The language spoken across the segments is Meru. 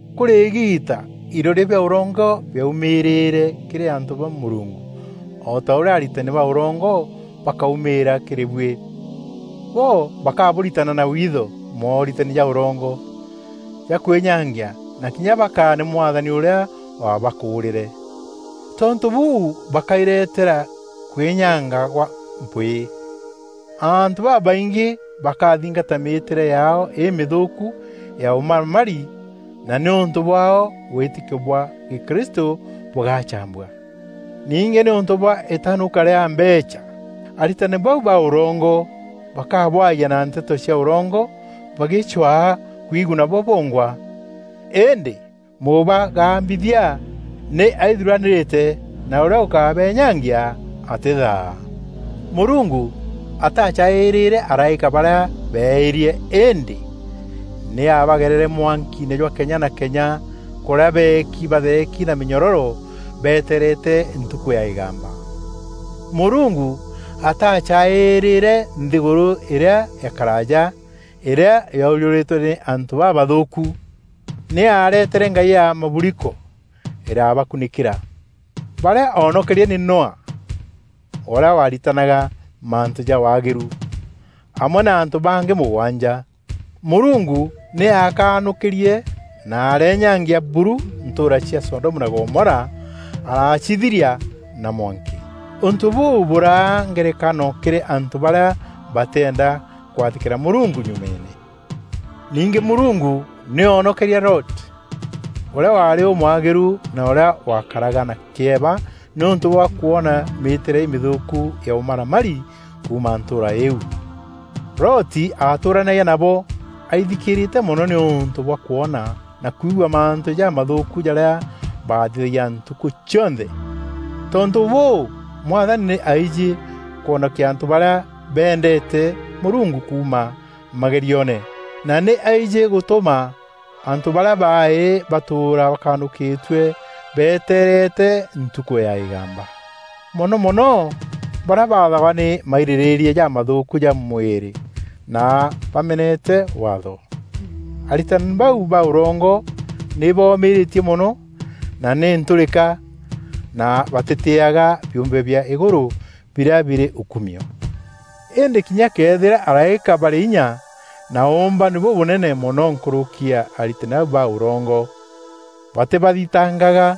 Kûrî îgiita iroria bia ûrongo biaumîrîîre kîrî antû ba Mûrungu o ta ûrîa aritani ba ûrongo bakaumîîra kîrî buî. Bo bakabûritana na witho mooritani ja ûrongo ja kwînyangia na kinya bakaane Mwathani ûrîa wabakûrîre. Tontû bûû bakairetera kwînyanga gwa mpwîî. Antû babaingî bakathingata mîîtîre yaao îmîthûûkû ya ûmaramari na nîûntû bwaao wîtîkio bwa gîkristû bûgacambua. Ningî nîûntû bwa îtenûka rîa mbeecha, aritani bau ba ûrongo bakabwayia na nteto cia ûrongo bagîcwaa kwiguna bo bongwa. Îndî Mûbagambithia nî aithuranîrîte na ûrîa ûkabeenyangia atîthaa. Mûrungu ataacaîîrîre araîka barîa beeîrie, îndî nî aabagerere mwankiine jwa kenya na kenya kûrîa beeki batheeki na mînyororo betereete Ntukû ya îgamba. Mûrungu ataacaîîrîre nthîgûrû îrîa ya karaaja, îrîa yoojûrîtwe nî antû babathûûku. Nî aaretere ngai ya maburiko îrabakunîkîra. Barîa oonokerie nî Noa, ûrîa waritanaga mantû ja waagîru, amwe na antû bangî mûgwanja. Mûrungu nî aakanûkîrie na areenyangia buru ntûûra cia Sodomu na Gomora, aracithiria na mwanki. Ûntû bûû bûraa ngerekano kîrî antû barîa batîenda kwathîkîra Mûrungu nyumeene. Ningî Mûrungu nî oonokerie Loti, ûrîa waarî ûmwagîru na ûrîa waakaraga na kîeba nîûntû bwa kwona mîîtîre îmîthûûku ya ûmaramari, kuuma ntûûra iu. Loti aatûûranagia nabo aithikîrîte mono nîûntû bwa kwoona na kwigua mantû jamathûûku jarîa baathithagia ntukû cionthe. Tontû bûû, Mwathani nî aijî kwonokia antû barîa beendeete Mûrungu kuuma magerioone na nî aijî gûtûma antû barîa baaî batûûra bakanûkîtue beeteerete Ntukû ya îgamba, mono mono barîa bathagwa nî mairîrîîria jamathûûku ja mwîrî na bamenete Waatho. Aritani bau ba ûrongo nî boomîrîtie mono na nî ntûrîka na batîtîîaga biûmbe bia îgûrû birîa birî ûkumio. Îndî kinya këethîra araîka barî inya na ûûmbani bûbûnene mono nkûrûki ya aritani bau ba ûrongo, batîbathitangaga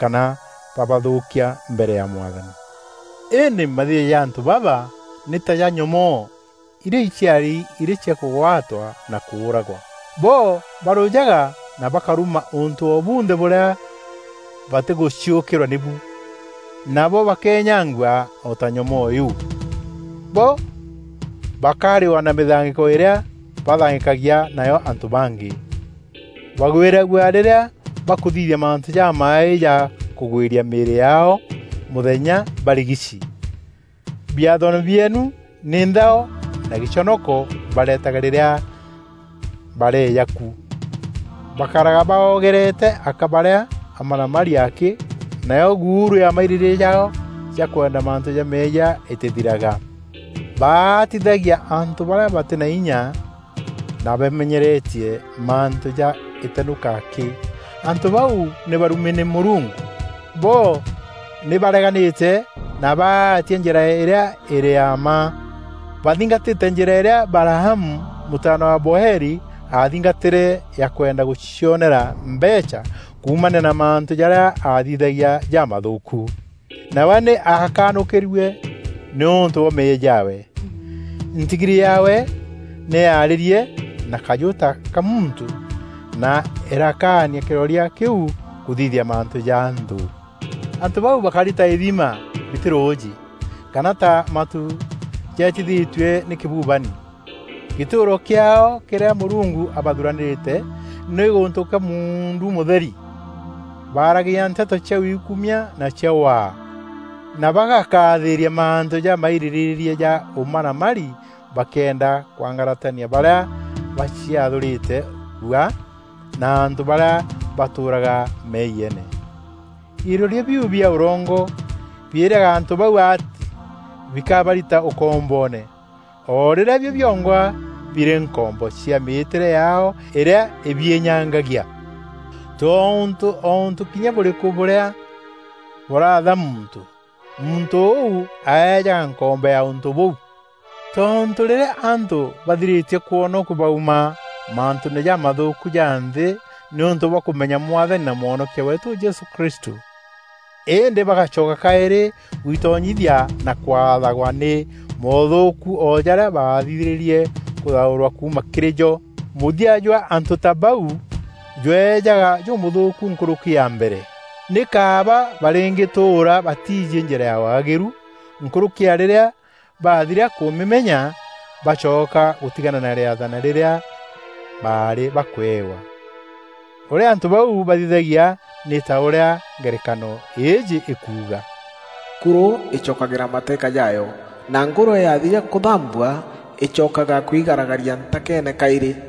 kana babathûûkia mbere ya Mwathani. Îndî mathithio ja antû baba nî ta ja nyomoo irîa iciari irî cia kûgwatwa na kûûragwa. Bo barûjaga na bakaruma ûntû o bunthe bûrîa batîgûciûkîrwa nîbu. Nabo bakeenyangua o ta nyomoo iu. Bo bakarîwa na mîthangîko îrîa bathangîkagia nayo antû bangî. Bagwîragua rîrîa bakûthithia mantû jamaaî ja kûgwîria mîîrî yaao mûthenya barigici. Biathoone bieenu nî nthao na gîconoko baretaga rîrîa bareeja ku. Bakaraga baogereete aka barîa amaramari akî nayo guuru ya mairîrîîria jaao ja kwenda mantû ja meeyia îtîthiraga. Baatithagia antû barîa batî na inya na bamenyeretie mantû ja îtenûka akî. Antû bau nî barumi nî Mûrungu! Bo nî bareganîte na baatia njîra îrîa îrî ya mma. Bathingatîte njîra îrîa Balaamu mûtaana wa Beori aathingatîre ya kwenda gûcionera mbeecha kuumania na mantû jarîa aathithagia jamathûûku. Nawe nî akanûkîrue nîûntû bwa meeyia jaawe. Ntigiri yaawe nî yaarîrie na kajû ta ka muntû na îrakaania kîroria kîu kûthithia mantû ja nthû. Antû bau bakari ta ithima bitî rûûjî, kana ta matu jeetithîtue nî kîbubani. Gîtûûro kîaao kîrîa Mûrungu abathuranîrîte nî gûntû kwa muundu mûtheri. Baaragia nteto cia wiikumia na cia waa, na bagakathîîria mantû ja mairîrîîria ja ûmaramari bakîenda kwangaratania barîa baciathûrîte rua na antû barîa batûûraga meeyiene. Iroria biu bia ûrongo biîraga antû bau atî bikabarita ûkomboone o rîrîa bio biongwa birî nkombo cia mîîtîre yaao îrîa îbiînyangagia. Tontû o ûntû kinya bûrîkû bûrîa bûraatha muntû, muntû ûu aejaga nkombo ya ûntû bûu. Tontû rîrîa antû bathirîtie kwonokua bauma mantûûne jamathûûku ja nthî nîûntû bwa kûmenya Mwathani na Mwonokia weetû Jesû Kristû, îndî bagacoka kaîrî gwitonyithia na kwathagwa nî moothûûku o jarîa baathirîrie kûthaûrwa kuuma kîrî jo, mûthia jwa antû ta bau jweejaga jûmûthûûku nkûrûki ya mbere. Nî kaaba barîngîtûûra batiijî njîra ya waagîru nkûrûki ya rîrîa baathiria kûmîmenya, bacoka gûtigana na rîathana rîrîa baarî bakwewa. Ûrîa antû bau bathithagia nî ta ûrîa ngerekano îîjî ikuuga, “Kurû îcokagîra mataîka jaayo,” na “Ngûrwe yathiria kûthambua, îcokaga kwigaragaria ntakeene kaîrî.”